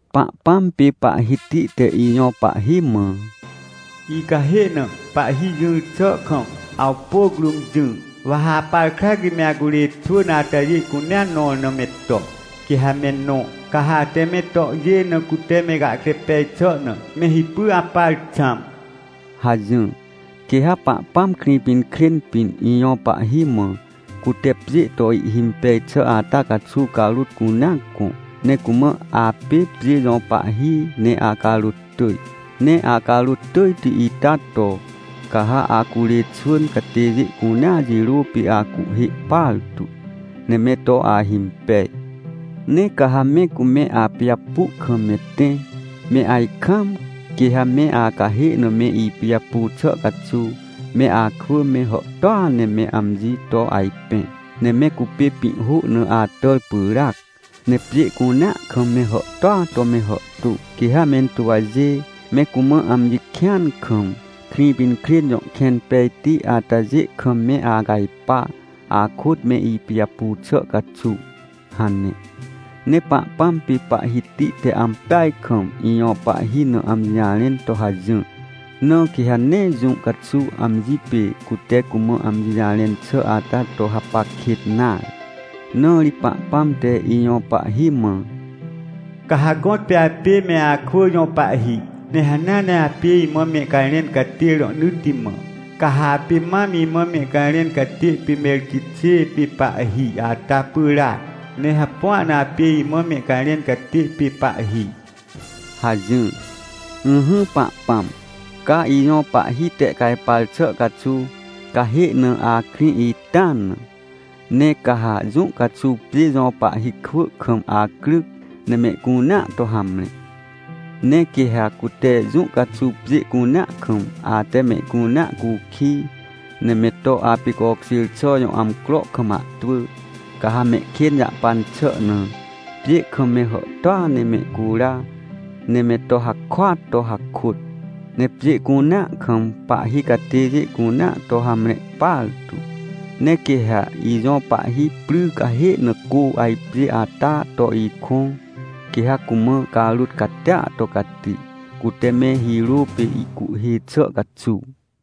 Pahpãm pê Pahhiti te ijõ Pahhi mã: “Icahê na, Pahhi jỹr xà kam, awpôc rũm jỹ. Wa ha apar krac ri me acurê xwỳn atajê cunea nõr na me to, quê ha me nõ. Ca ha ate me tohjê na cute me gahkre pej xà na, me hipy apar xãm” hajỹr. Quê ha Pahpãm Krĩpinkrên pĩn, ijõ Pahhi mã, cute pjê to ihhimpej xà ata caxuw carôt cunea gõ, ne cumã: “Apê pjê jõ Pahhi ne acarôt tỳj. Ne acarôt tỳjti ita to, ca ha acurê xwỳn catêjê cunea jirô pê acuhhê partu, ne me to ahimpej. Ne ca ha me cume apijapu kam me tẽ me ajkaam, quê ha me acahê na me ipijapu xà caxuw, me akwỳ me hàhtôa ne me amji to ajpẽ. Ne me cupê pĩhhô na atàr pyràac, ne pjê cunea kam me hàhtôa to me hàhtô. Quê ha mentuwjê, me cumã amji kĩan kam, Krĩpinkrên jõ kẽn pejti atajê kam me acajpa, akôt me ipijapu xà caxuw” hane. Ne Pahpãm pê Pahhiti te ampeaj kam ijõ Pahhi na amji jarẽn to hajỹr, na quê ha nee jũ caxuw amji pê cute cumã amji jarẽn xà ata to hapac kêt nare. Na ri Pahpãm te ijõ Pahhi mã: “Ca ha gõtpê apê me akwỳ jõ Pahhi. Ne hanea ne apê imã mehcajrẽn catê rohnỳtti mã. Ca ha apê mam imã mehcajrẽn catê pê Merquixê pê Pahhi ata pyràac, ne hapua na apê imã mehcajrẽn catê pê Pahhi” hajỹr. Ỹhỹ Pahpãm, ca ijõ Pahhi tehcajpar xà caxuw, cahê na akrĩ ita na. Ne ca ha jũ caxuw pjê jõ pahhi kwỳ kam acryc, ne mehcunea to hamre. Ne quê ha cute jũ caxuw pjê cunea kam ate mehcunea cukij, ne me to apicokjêr xà jõ amcro kam ahtwỳ, ca ha mehkên jahpan xà na, pjê kam me hàhtôa ne mehcura ne me to hakôat to hakôt, ne pjê cunea kam pahhi catêjê cunea to hamre partu. Ne quê ha ijõ Pahhi pry cahê na cô ajpjê ata to ikõ, quê ha cumã carôt catia to cati, cute me hirô pê ihcuhhê xà caxuw.